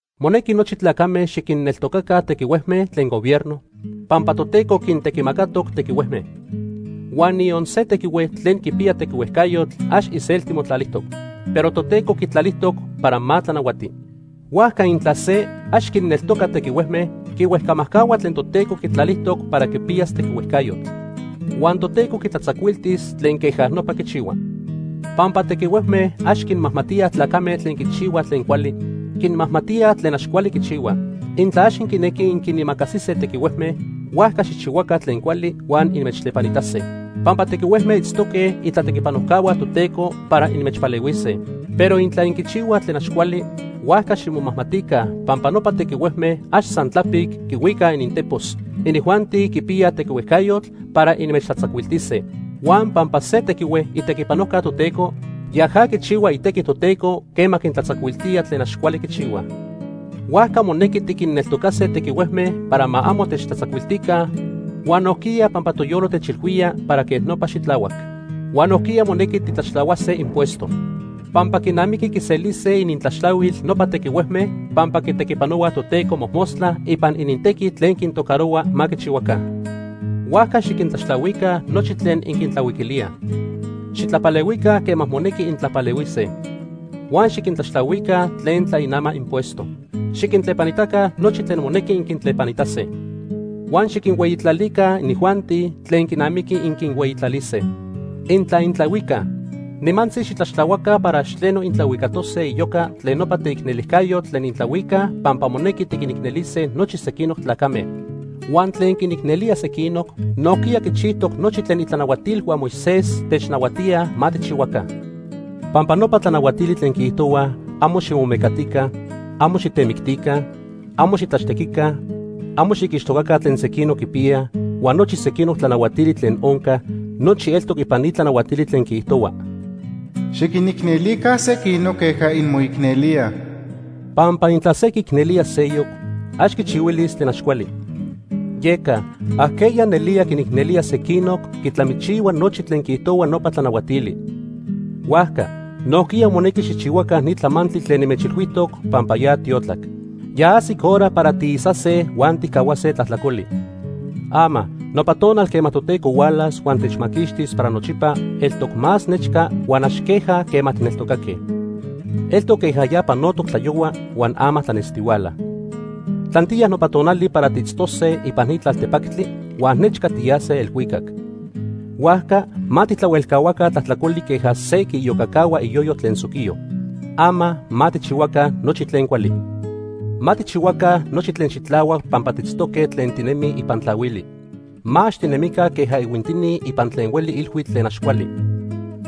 Monequi nochi tlacame xiquinneltocaca tequihuejme tlen gobierno, pampa Toteco quintequimacatoc tequihuejme. Huan niyon se tequihue tlen quipiya tequihuejcayotl ax iselti motlalijtoc, pero Toteco quitlalijtoc para ma tlanahuati. Huajca intla se ax quinneltoca tequihuejme, quihuejcamajcahua tlen Toteco quitlalijtoc para quipiyas tequihuejcayotl. Huan Toteco quitlatzacuiltis tlen queja nopa quichihua. Pampa tequihuejme ax quinmajmatíaj tlacame tlen quichihuaj tlen cuali, quinmajmatíaj tlen ax cuali quichihuaj. Intla ax inquinequij inquinimacasise tequihuejme, huajca xijchihuaca tlen cuali huan inmechtlepanitase. Pampa tequihuejme itztoque itlaquipanojcahua Toteco para inmechpalehuise. Pero intla inquichihuaj tlen ax cuali, huajca ximomajmatica pampa nopa tequihuejme ax san tlapic quihuicaj inintepos. Inijuanti quipiyaj tequihuejcayotl para inmechtlatzacuiltise. Huan pampa se tequihue itequipanojca Toteco, yaja quichihua itequi Toteco quema quintlatzacuiltía tlen ax cuali quichihuaj. Huajca monequi tiquinneltocase tequihuejme para ma amo techtlatzacuiltica huan nojquiya pampa toyolo techilhuía para quej nopa xitlahuac. Huan nojquiya monequi titlaxtlahuase impuesto. Pampa quinamiqui quiselise inintlaxtlahuil nopa tequihuejme pampa quitequipanohuaj Toteco mojmostla ipan inintequi tlen quintocarohua ma quichihuaca. Huajca xiquintlaxtlahuica nochi tlen inquintlahuiquilíaj. Xitlapalehuica quema monequi intlapalehuise. Huan xiquintlaxtlahuica tlen tlainamaj impuesto. Xiquintlepanitaca nochi tlen monequi inquintlepanitase. Huan xiquinhueyitlalica inijuanti tlen quinamiqui inquinhueyitlalise. Intla intlahuicaj, nimantzi xitlaxtlahuaca para ax tleno intlahuicatose iyoca tlen nopa teicnelijcayotl tlen intlahuicaj pampa monequi tiquinicnelise nochi sequinoc tlacame. Huan tlen quinicnelía sequinoc, nojquiya quichijtoc nochi tlen itlanahuatilhua Moisés technahuatíaj ma tijchihuaca. Pampa nopa tlanahuatili tlen quiijtohuaj amo ximomecatica, amo xitemictica, amo xitlaxtequica, amo xiquixtocaca tlen sequinoc quipiyaj huan nochi sequinoc tlanahuatili tlen oncaj, nochi eltoc ipan ni tlanahuatili tlen quiijtohua: “Xiquinicnelica sequinoc queja inmoicnelíaj.” Pampa intla se quiicnelía seyoc, ax quichihuilis tlen ax cuali. Yeca ajqueya nelía quinicnelía sequinoc quitlamichihua nochi tlen quiijtohuaj nopa tlanahuatili. Huajca nojquiya monequi xijchihuaca ni tlamantli tlen nimechilhuijtoc pampa ya tiotlac. Ya ajsic hora para tiisase huan tijcahuase tlajtlacoli. Ama nopa tonal quema Toteco hualas huan techmaquixtis para nochipa eltoc más nechca huan ax queja quema tijneltocaque. Eltoc queja ya panotoc tlayohua huan ama tlanestihuala. Tlantiya nopa tonali para tiitztose ipan ni tlaltepactli huan nechca tiyase elhuicac. Huajca ma tijtlahuelcahuaca tlajtlacoli queja se quiiyocacahua iyoyo tlen soquiyo. Ama ma tijchihuaca nochi tlen cuali. Ma tijchihuaca nochi tlen xitlahuac pampa tiitztoque tlen tinemij ipan tlahuili. Ma ax tinemica queja ihuintini ipan tlen hueli ilhuitl tlen ax cuali.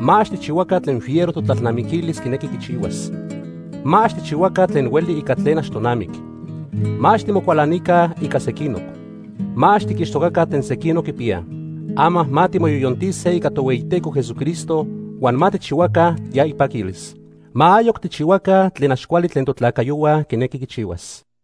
Ma ax tijchihuaca tlen fiero totlalnamiquilis quinequi quichihuas. Ma ax tijchihuaca tlen hueli ica tlen ax tonamic. Ma ax timocualanica ica sequinoc. Ma ax tiquixtocaca tlen sequinoc quipiyaj. Ama ma timoyoyontise ica Tohueyiteco Jesucristo, huan ma tijchihuaca ya ipaquilis. Ma ayoc tijchihuaca tlen ax cuali tlen totlacayohua quinequi quichihuas.